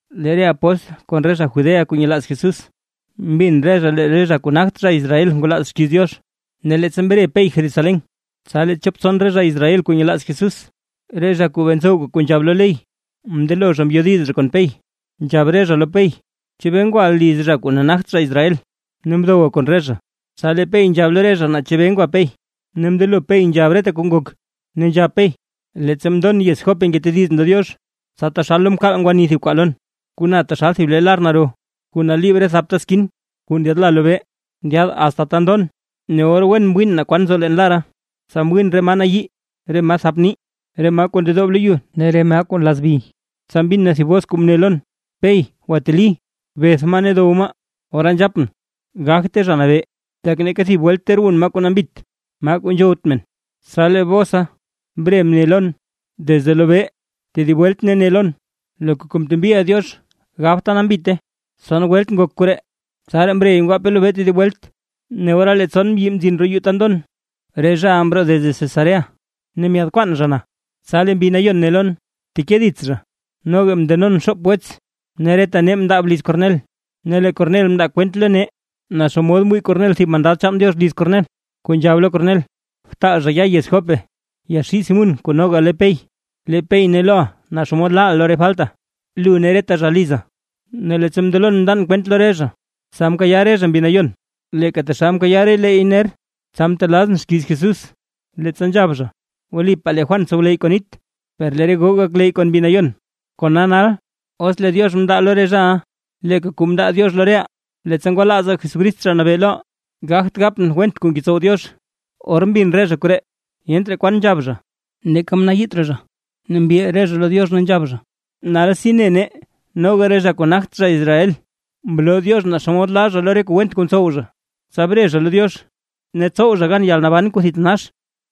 Lee re apóstl kon re zha Judea kuu nyelaaz Jesús, mbin re zha lee re zha kuu nagt zha Israel ngwalaaz xkiiz Diox. Ne leettsa mre Pey Jerusalén, tsa lee chop tson re zha Israel kuu nyelaaz Jesús, re zha kuu bee ntsowka kuu nzhab lo ley, mndelo zha mbyodiz zha kon Pey. Ne nzhab re zha lo Pey: ―¿Chebee ngwaʼa liz zha kuu nagt zha Israel, ne mdowa kon re zha? Tsa lee Pey nzhab lo re zha, naa chebee ngwa Pey, ne mndelo Pey nzhab reta kuu ngok. Ne nzhab Pey: ―Leettsa mndon yez Jope ngetedizʼn lo Diox, tsa taxal lo mkaal ngwani thib kwaa lon: Kuu na taxal thib le lar naro kuu naliib re thapta skin kuu ndyaadla lobee, ndyaad asta ta ndon. Ne or wen mwiin naa kwan nzo leen lara, tsa mwiin re maa nayii, re maa thap nii, re maa kuu ndedoob lo yu ne re maa nlazbi. Tsa mbin na thib bos kuu mne lon: “Pey, gwateli, beth maa ne dow maa”. Ora nzhapʼn: “Gagte Zha Nabee, tak neeka thib welt ter wun maa kuu nambit, maa kuu nzhowt men”. Tsa lee bosa mre mni lon desde lobee tedib welt ne ne lon: “Loka kuu mtembiʼa Diox gabta nambite”. Tson welt ngok koree, tsaraa mrey ngwape lobee tedib welt. Ne ora lee tson mbyi mzin roo yuu ta ndon, re zhaʼa mroo desde Cesarea ne myaad kwaan zha na. Tsa lee Mbi Nayon ne lon: “Bteke dits zha”; noga mndenon xoop wets, ne reta nee mndaab liz Kornel. Ne lee Kornel mndaa kwent lo nee, naa xomod mwii Kornel thib mandad chaan Diox liz Kornel, kuu nzhab lo Kornel: “Btaal zha ya yez Jope yaxii Simún kuu noga le Pey; lee Pey ne loʼa naa xomod laaʼa lo re falta, lu ne reta zha liza”. Ne leettsa mndelon mndan kwent lo re zha, tsa mkayaa re zha Mbi Nayon, leeka taxal mkayaa releey ner. Tsa mtelaazʼn xkiiz Jesús, leettsa nzhab zha: “Wlipaa lee Juan mtsowleyy kon nit, per lee re goo gakleyy kon Mbi Nayon”. Kona nal, os lee Diox mndaa lo re zhaʼa leeka kuu mndaa Diox lo reʼaa, leettsa ngwalaazaa Jesucrist Zha Nabee loʼaa, gagt gapʼn went kuu ngetsow Diox. Or mbin re zha koree, yent raa kwan nzhab zha, neeka mnayiit raa zha, ne mbil re zha lo Diox ne nzhab zha: ―¡Nalsi ne nee noga re zha kuu nagt zha Israel, mloo Diox naa xomod laa zha lo re kuu went kuu ntsow zha, tsa bre zha lo Diox, ne tsow zha gan yalnaban kuu thitanax!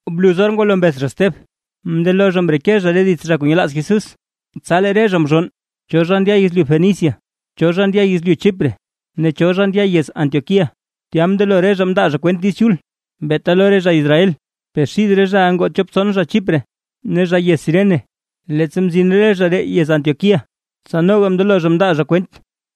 Bluz or ngwalo mbeth zha Steb, mndelo re zha mreke zha dits re zha kuu nyelaaz Jesús, tsa lee re zha mzhonn, cho zha ndya yezlyu Fenicia, cho zha ndya yezlyu Chipre ne cho ndya yez Antioquía, tya mndelo re zha mndaa zha kwent Diiz Chul, beeta lo re zha Israel. Per xid re zhaʼa ngoo chop tson zha Chipre ne zha yez Cirene, leettsa mzin re zha ree yez Antioquía, tsa noga mndelo zha mndaa zha kwent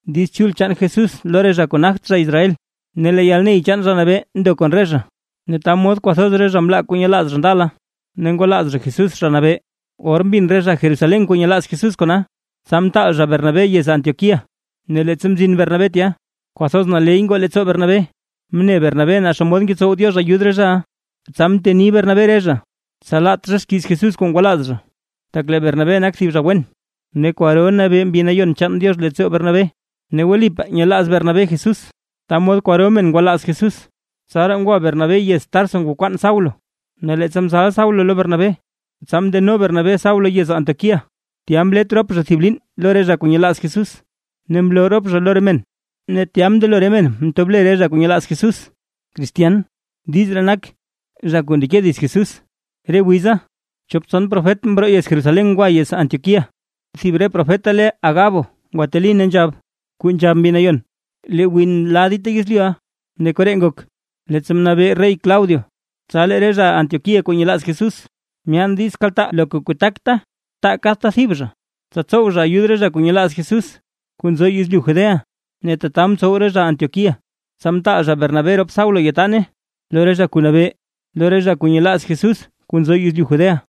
Diiz Chul chaan Jesús lo re zha kuu nagt zha Israel. Ne lee yalney chaan Zha Nabee ndo kon re zha, ne ta mod kwathoz zha mlaa re kuu nyelaaz zha ndala, ne ngwalaaz Jesús Zha Nabee. Or mbin re zha Jerusalén kuu nyelaaz Jesús kona, tsa mtaal zha Bernabé yez Antioquía. Ne leettsa mzin Bernabé tya, kwathoz naley ngoo leettsoo Bernabé mne Bernabé naa xomod ngetsow Diox ayud re zhaʼa, tsa mteni Bernabé re zha, tsa laat zha xkiiz Jesús kuu ngwalaaza zha. Tak lee Bernabé nak thib zha wen, ne kwaro nabee Mbi Nayon chaan Diox leettsoo Bernabé, ne wlipaa nyelaaz Bernabé Jesús. Ta mod kwaro men ngwalaaz Jesús. Tsaraa ngwa Bernabé yez Tarso ngwakwaan Saulo, ne leettsa mzal Saulo lo Bernabé, tsa mndeno Bernabé Saulo yez Antioquía, tya mlet rop zha thib liin lo re zha kuu nyelaaz Jesús ne mloo rop zha lo re men. Ne tya mndelo re men mtob le re zha kuu nyelaaz Jesús “cristian”. (Diiz ree nak: “zha kuu ndeke dits Jesús”.) Re wiza, chop tson profet mroo Jerusalén ngwa yez Antioquía. Thib re profeta le Agabo ngwateli ne nzhab, kuu nzhab Mbi Nayon: ―Lee win la dita yezlyuʼa. Ne koree ngok, leettsa mnabee rey Claudio. Tsa lee re zha Antioquía kuu nyelaaz Jesús, myaan diiz kaltaa loka kuu takta taa kadta thib zha, tsa tsow zha ayud re zha kuu nyelaaz Jesús kuu nzo yezlyu Judea. Ne tata mtsow re zha Antioquía, tsa mtaal zha Bernabé rop Saulo yataane lo re zha kuu nabee, lo re zha kuu nyelaaz Jesús kuu nzo yezlyu Judea.